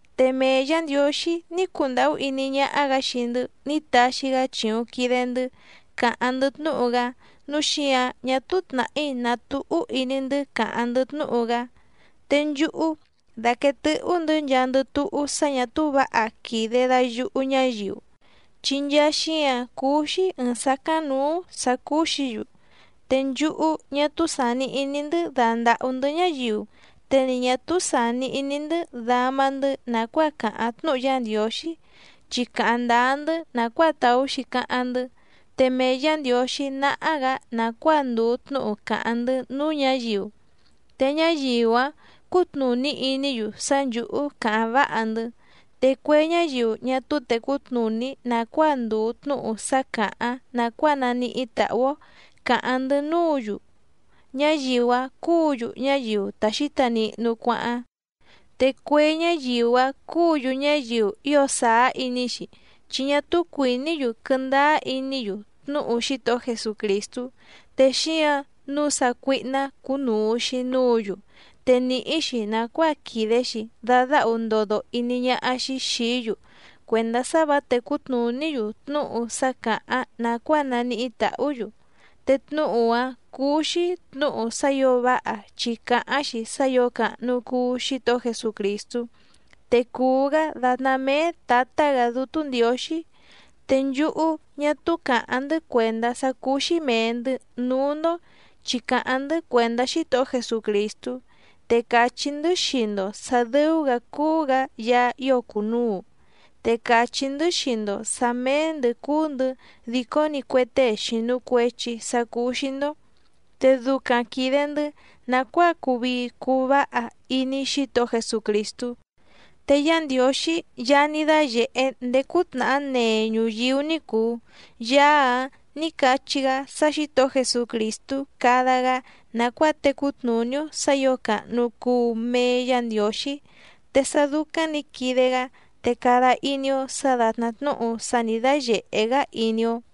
Te mee Yǎ Ndiǒxí ní cundàhú iní ñáhá‑gǎ xii‑ndɨ́ ní taxi‑gá chìuⁿ quide‑ndɨ́ càháⁿ‑ndɨ́ tnúhu‑gá, núu xíǎⁿ ñá túú tnàhí nàtúhú iní‑ndɨ́ càháⁿ‑ndɨ́ tnúhu‑gá. Te nchúhú dàquee tɨ́hú‑ndɨ̌ nchaandɨ túhú sá ñà túú vǎha quìde dayuhu ñáyiu, chi nchaa xíǎⁿ cúú‑xí ɨ̀ɨⁿ sácáⁿnǔú sǎ cúú‑xǐ‑yu, te nchúhú ñá túú sàni iní‑ndɨ́ dandàhú‑ndɨ́ ñáyiu te ni ñǎ túú sàni iní‑ndɨ́ dama‑ndɨ́ nàcuáa càháⁿ tnúhu Yá Ndiǒxí, chi càháⁿ ndáá‑ndɨ́ nàcuáa tàú‑xi cáháⁿ‑ndɨ́, te mee Yǎ Ndiǒxí náhá‑gǎ nàcuáa ndùu tnúhu càháⁿ‑ndɨ́ núú ñǎyiu, te ñáyiu‑áⁿ cútnùní iní‑yu sá nchǔhú càháⁿ váha‑ndɨ́. Te cue ñáyiu ñá túú tècú tnùní nàcuáa ndùu tnúhu sá càháⁿ nàcuáa naníhí tàhú‑ó càháⁿ‑ndɨ́ núǔ‑yu, ñáyiu‑áⁿ cúǔ‑yu ñáyiu ta xǐta nihnu cuáháⁿ. Te cue ñáyiu‑áⁿ cúǔ‑yu ñáyiu ío sàá iní‑xi chi ñá túú cuìní‑yu quɨ́ndáá iní‑yu tnúhu Xítohó Jesucrìstú, te xíǎⁿ nǔu sácuíhná cúnùu‑xi núǔ‑yu te nìhí‑xi nàcuáa quìde‑xi dadáhu ndodo iní ñáhá‑xí xìí‑yu cuèndá sá vǎ tècú tnùní‑yu tnúhu sá càháⁿ nàcuáa naníhí tàhú‑yu, te tnúhu‑áⁿ cúú‑xí tnǔhu sá ǐo váha chi càháⁿ‑xi sá ǐo càhnu cuu Xítohó Jesucrìstú, te cùu‑gá dàtná méé Tǎtá‑gǎ Dútú Ndiǒxí. Te nchúhú ñá túú càháⁿ‑ndɨ́ cuèndá sá cúú‑xí mèe‑ndɨ́ núú‑ndó chi càháⁿ‑ndɨ́ cuèndá Xítohó Jesucrìstú, te càchí‑ndɨ́ xii‑ndo sǎ dɨ́ú‑gǎ cúú‑gǎ Yaá ío cùnuu, te càchí‑ndɨ́ xii‑ndo sǎ méé‑ndɨ̌ cúú‑ndɨ̌ dìcó‑ni cue tée xìnu cuechi sá cúú‑xí‑ndó, te ducaⁿ quìde‑ndɨ́ nàcuáa cuu vii cuu váha iní Xítohó Jesucrìstú. Te Yá Ndiǒxí Yaá ní dáyèhé ndéé cútnàhá nee ñuyíú ní cùu, Yaá‑áⁿ nǐ cachí‑gá sá Xǐtohó Jesucrìstú cada‑gá nàcuáa tecú tnùní‑ó sǎ ǐo càhnu cuu mee Yá Ndiǒxí. Te sá dúcáⁿ nǐ quide‑gá te cada iní‑ó sǎ dàtná tnúhu sá nǐ dáyèhé‑gá iní‑ó.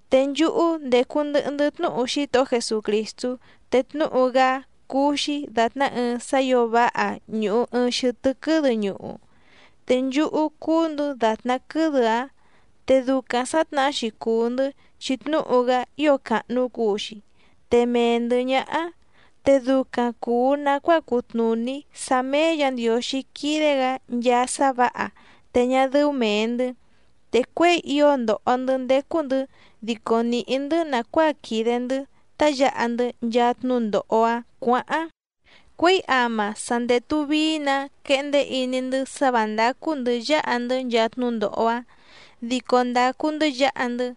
Te nchúhú ndécú ndɨ̀hɨ‑ndɨ́ tnúhu Xítohó Jesucrìstú, te tnúhu‑gá cúú‑xí dàtná ɨɨⁿ sá ǐo váha ñùhu ɨɨⁿ xɨtɨ́ quɨ́dɨ ñuhu, te nchúhú cúú‑ndɨ̌ dàtná quɨ́dɨ‑áⁿ. Te ducaⁿ sǎtnahá‑xi cùu‑ndɨ́ chi tnúhu‑gá ío càhnu cuu‑xi te mee‑ndɨ̌ ñáhá, te ducaⁿ cùu nacuáa cutnùní sá méé Yǎ Ndiǒxí quídé‑gǎ nchaa sá vǎha te ñá dɨ́ú mèe‑ndɨ́. Te cuěi ío ndòho‑ndɨ́ ndécú‑ndɨ̌ dico nìhí‑ndɨ́ nàcuáa quìde‑ndɨ́ tá yǎha‑ndɨ́ nchaa tnúndòho‑áⁿ cuǎháⁿ, cuěi áma sa ndètu vií‑nǎ quehndé iní‑ndɨ́ sá vǎ ndácú‑ndɨ̌ yáha‑ndɨ́ nchaa tnúndòho‑áⁿ, dico ndàcu‑ndɨ́ yǎha‑ndɨ́.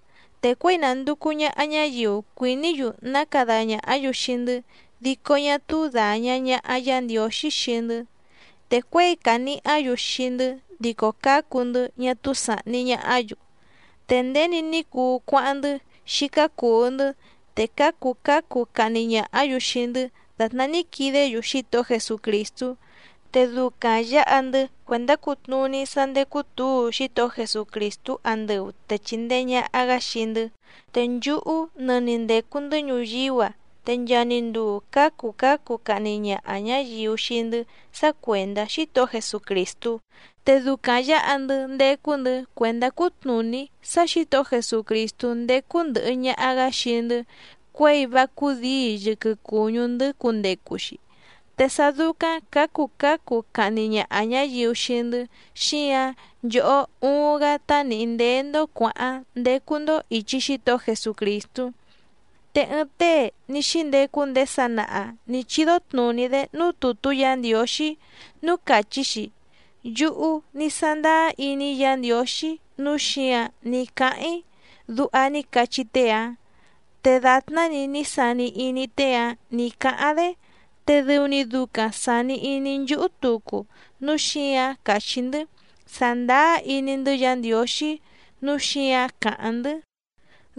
Te cuěi nànducu ñaha ñáyiu cuìní‑yu ná cada ñàhá‑yu xii‑ndɨ́ dico ñá túú dàña ñaha Yá Ndiǒxí xii‑ndɨ́, te cuěi cànihá‑yu xii‑ndɨ́ dico cǎcu‑ndɨ́ ñá túú sàhni ñahá‑yu. Te nděni ní cuu cuáháⁿ‑ndɨ́ xícá cùu‑ndɨ́, te cǎcu cǎcu cahni ñàhá‑yu xii‑ndɨ́ dàtná ní quidé‑yu Xítohó Jesucrìstú, te ducaⁿ yǎha‑ndɨ́ cuèndá cutnùní sá ndécú tǔu Xítohó Jesucrìstú andɨu te chìndee ñaha‑gá xii‑ndɨ́. Te nchúhú nɨni ndècu‑ndɨ́ ñuyíú‑a te nchaa‑ni nduu cǎcu cǎcu cahni ñaha ñǎyiu xii‑ndɨ́ sá cuèndá Xítohó Jesucrìstú, te ducaⁿ yǎha‑ndɨ́ ndécú‑ndɨ̌ cuèndá cutnùní sá Xǐtohó Jesucrìstú ndécú ndɨ̀hɨ ñaha‑gá xii‑ndɨ́ cuěi vá cúdǐi yɨquɨ cùñú‑ndɨ́ cundecu‑xi. Te sá dúcáⁿ cǎcu cǎcu cahni ñaha ñǎyiu xii‑ndɨ́ xíǎⁿ nchòhó uuⁿ‑gá tá nìhí ndéé‑ndó cuǎháⁿ ndécú‑ndó ìchi Xítohó Jesucrìstú. Te ɨɨⁿ tée ní xíndecu ndéé sanaha nǐ chídó tnùní‑dé núú tùtú Yǎ Ndiǒxí núú càchí‑xi: “Yúhú ní sándáá iní‑í Yǎ Ndiǒxí nǔu xíǎⁿ ní cáháⁿ‑í”, duha ní cachí tée‑áⁿ. Te dàtná‑ni ní sani iní tée‑áⁿ nì cáháⁿ‑dé te dɨu‑ni ducaⁿ sàni iní nchúhú tucu núu xíǎⁿ càchí‑ndɨ́: “Sàndáá iní‑ndɨ́ Yǎ Ndiǒxí nǔu xíǎⁿ càháⁿ‑ndɨ́”,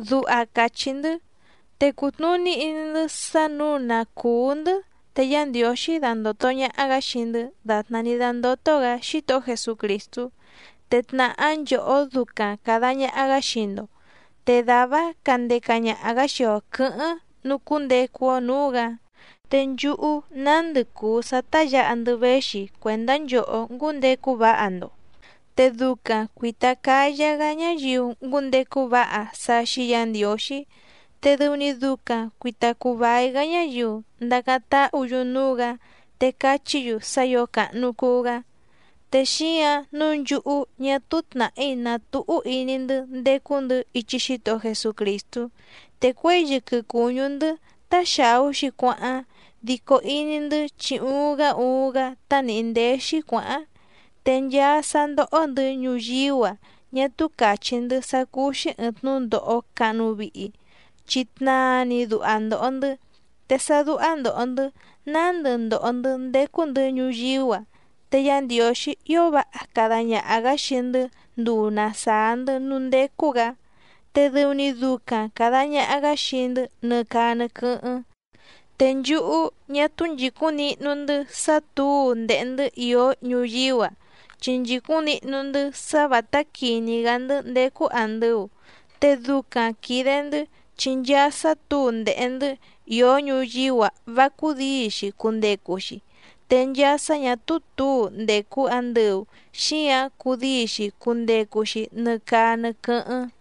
duha càchí‑ndɨ́. Te cùtnuní iní‑ndɨ́ sá nǔu na cùú‑ndɨ́ te Yá Ndiǒxí dandòto ñaha‑gá xii‑ndɨ́ dàtná ní dándótó‑gǎ Xítohó Jesucrìstú, te tnàhá nchòhó ducaⁿ càda ñaha‑gá xii‑ndo, te dàvá‑áⁿ candeca ñaha‑gǎ xii‑o quɨ̌hɨ́ⁿ nucúndecu‑o nǔú‑gǎ. Te nchúhú nándɨ cùu sá tá yǎha‑ndɨ́ véxi cuèndá nchòhó ngúndecu váha‑ndo, te ducaⁿ cuìta cáyá‑gá ñáyiu ngúndecu váha sá xíí Yǎ Ndiǒxí, te dɨu‑ni ducaⁿ cuìta cuu vai‑gá ñáyiu ndacáⁿ táhǔ‑yu núú‑gǎ te cachí‑yu sá ǐo càhnu cuu‑gá. Te xíǎⁿ nǔu nchúhú ñá túú tnàhí nàtúhú iní‑ndɨ́ ndécú‑ndɨ̌ ichi Xítohó Jesucrìstú, te cuěi yɨquɨ cùñú‑ndɨ́ tá xàú‑xi cuáháⁿ dico iní‑ndɨ́ chi uuⁿ‑gá uuⁿ‑gá tá nìhí ndéé‑xí cuǎháⁿ. Te nchaa sá ndóhó‑ndɨ̌ ñuyíú‑a ñá túú càchí‑ndɨ́ sá cúú‑xí ɨ̀ɨⁿ tnúndòho cahnu vihi, chi tnaa‑ni duha ndòho‑ndɨ́, te sá dúhá ndòho‑ndɨ́ nándɨ ndòho‑ndɨ́ ndécú‑ndɨ̌ ñuyíú‑a te Yá Ndiǒxí ío váha cada ñaha‑gǎ xii‑ndɨ́ nduu na sàá‑ndɨ́ núú ndécú‑gǎ, te dɨu‑ni ducaⁿ càda ñaha‑gá xii‑ndɨ́ nɨ caa nɨ quɨ́hɨ́ⁿ. Te nchúhú ñá túú nchìcúⁿ nihnu‑ndɨ́ sá tǔu ndèhe‑ndɨ́ ìó ñuyíú‑a, chi nchìcúⁿ nihnu‑ndɨ́ sá vǎtá quìní‑gá‑ndɨ́ ndécú àndɨu, te ducaⁿ quìde‑ndɨ́ chi nchaa sá tǔu ndèhe‑ndɨ́ ìó ñuyíú‑a vá cúdǐi‑xi cundecu‑xi, te nchaa sá ñà túú tǔu ndècu andɨu xíǎⁿ cudíi‑xi cundecu‑xi nɨ caa nɨ quɨ́hɨ́ⁿ.